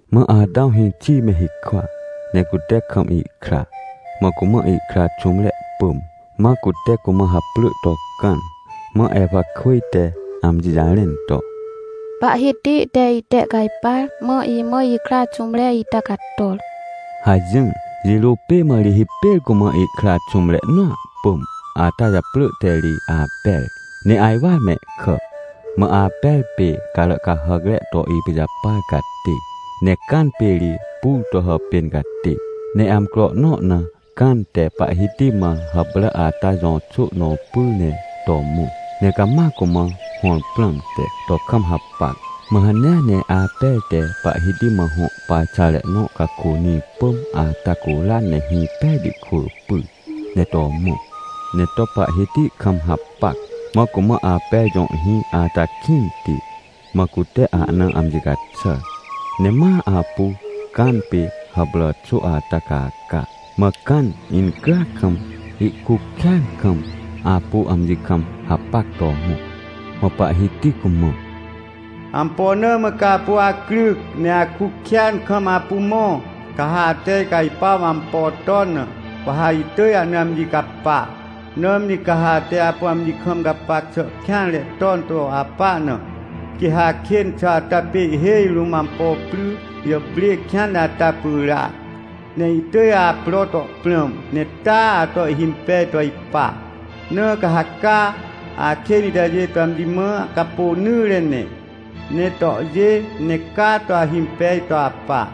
Mã Atãw hĩxi me hikwa, ne cute kam ihkra, mã cumã ihkra xũmre pỳm. Mã cute cumã haprỳ to Cãn. Mã Ewakwỳj te amji jarẽn to: — Pahhiti te itehcajpar, mã imã ikra xũmre ita cator — hajỹr. Jirô pê mã ri hipêr cumã ihkra xũmre nõa pỳm ata japrỳ te ri Aper. Ne ajwar mehkà. Mã Aper pê carà cahàcre to ipijapar catê, ne Cãn pê ri pur to hàpên catê. Ne amcro nõ na Cãn te Pahhiti mã hàprà ata jõ xô nõ pyr ne to mõ, ne cama cumã hõr prãmte, to kam hapac. Mã hanea ne Aper te Pahhiti mã hõ parxare nõ cakônĩ pỳm ata curan ne hĩ pejti kwỳ pyr, ne to mõ, ne to Pahhiti kam hapac. Mã cumã Aper jõ hĩ ata kĩnti, mã cute ahna amji caxàr. Ne ma apu Cãn pê hàprà xô ata caca. Mã Cãn incryac kam, ihkuc kêan kam, apu amji kam hapac to mõ. Mã Pahhiti cumã: — Ampo na mã ca apu acryc, ne akuc kêan kam apu mõ? Ca ha ate icajpuaw ampo ton na, wa ha itỳj ahna amji capa. Nãmri ca ha ate apu amji kam gapac xà kêanre ton to apa na, quê ha akên xà ata pê ihhêj rũm ampo pry jàprê kêanre ata pyràac, ne ihtỳj apro to prãm, ne taa ato ihhimpej to ipa. Na ca ha caa, akên itajê to amji mã capônỹre ne, ne tohjê, ne caa to ahimpej to apa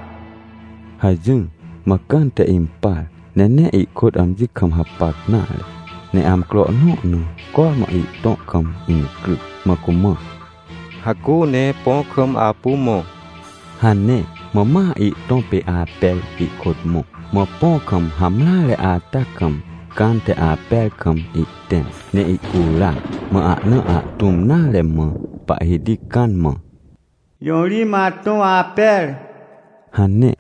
— hajỹr. Mã Cãn te impar, ne nee ihkôt amji kam hapac nare. Ne amcro nõ na cormã ihtõ kam incryc, mã cumã: — Hacu ne põ kam apu mõ — hane. Mã ma ihtõ pê Aper ihkôt mõ, mã põ kam hamreare ata kam, Cãn te Aper kam ihtẽm ne ihcuran. Mã ahna ahtũm nare mã Pahhiti Cãn mã: — Jõ ri mã atõ Aper? — hane.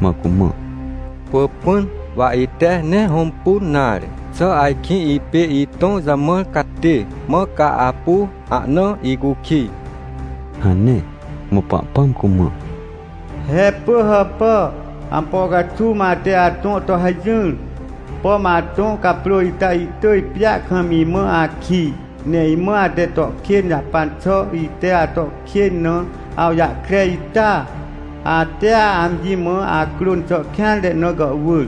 Mã cumã: — Pỳpỹn, wa ite nee hõmpun nare. Xà ajkĩ ipê itõ jamãr catê, mã ca apu ahna icukij? — hane. Mã Pahpãm cumã: — He pỳhàpà! Ampo caxuw mã ate atõ to hajỹr? Pom atõ caprô ita ihtỳj pjêa kam imã akij, ne imã ate to kên jahpan xà ite ato kên na, awjahkre ita? Atea amji mã acrôn xà kêanre na gàhwỳr,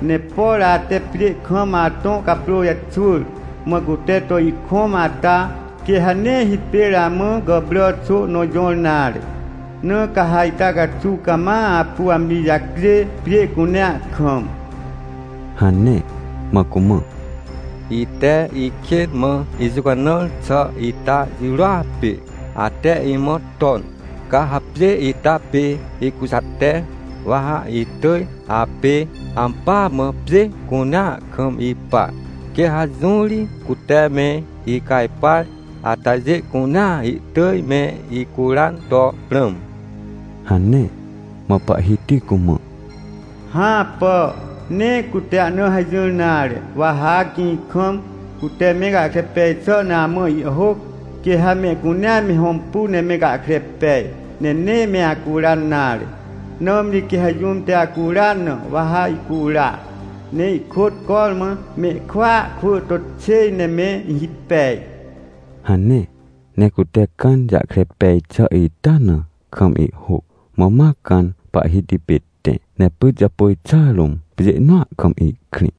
ne por ate pjê kam atõ caprô jaxwỳr, mã cute to ihkõm ata, quê ha nee hipêr amã gàprà xô nõ jõr nare. Na ca ha ita caxuw cama apu amji jacjê, pjê cunea kam — hane. Mã cumã: — Ite ikên mã ijũcanãr xà ita jirôa pê, ate imã ton. Ca ha pjê ita pê ikujate, wa ha itỳj apê ampỳa mã pjê cunea kam ipa. Quê ha jũ ri cute me icajpar atajê cunea ihtỳj me icuran to prãm — hane. Mã Pahhiti cumã: — Hãpà, nee cute ahna hajỹr nare. Wa ha gĩ kam, cute me gahkre pej xà na amã ihhôc, quê ha mehcunea me hõmpu ne me gahkre pej, ne nee me acuran nare. Nãmri quê ha jũm te acuran na, wa ha ihcura, ne ihkôt cormã mehkwỳa kwỳ to xêj ne me hipej — hane. Ne cute Cãn jahkre pej xà ita na kam ihhôc, mã ma Cãn Pahhiti pê tẽ, ne pyt japôj xà rũm, pjê nõa kam ihkrĩ.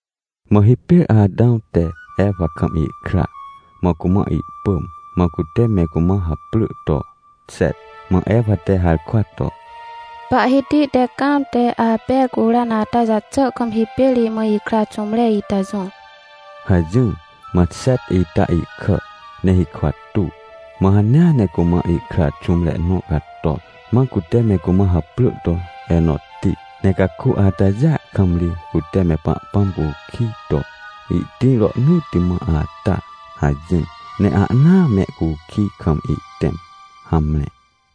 Mã hipêr Atãw te Ewa kam ihkra, mã cumã ihpỳm, mã cute me cumã haprỳ to Xet. Mã Ewa te harkwa to: — Pahhiti te Cãn te Aper curan ata jaxà kam hipêr imã ikra xũmre ita jõr — hajỹr. Mã Xet ita ihkà, ne hikwa tuw, mã hanea ne cumã ihkra xũmre nõ cator, mã cute me cumã haprỳ to Enotti. Ne caku atajêa kam ri cute me Pahpãm cukij to: “Ihtĩr Rohnỳtti Mã Ata” hajỹr, ne ahnaa me cukij kam ihtẽm. Hamre.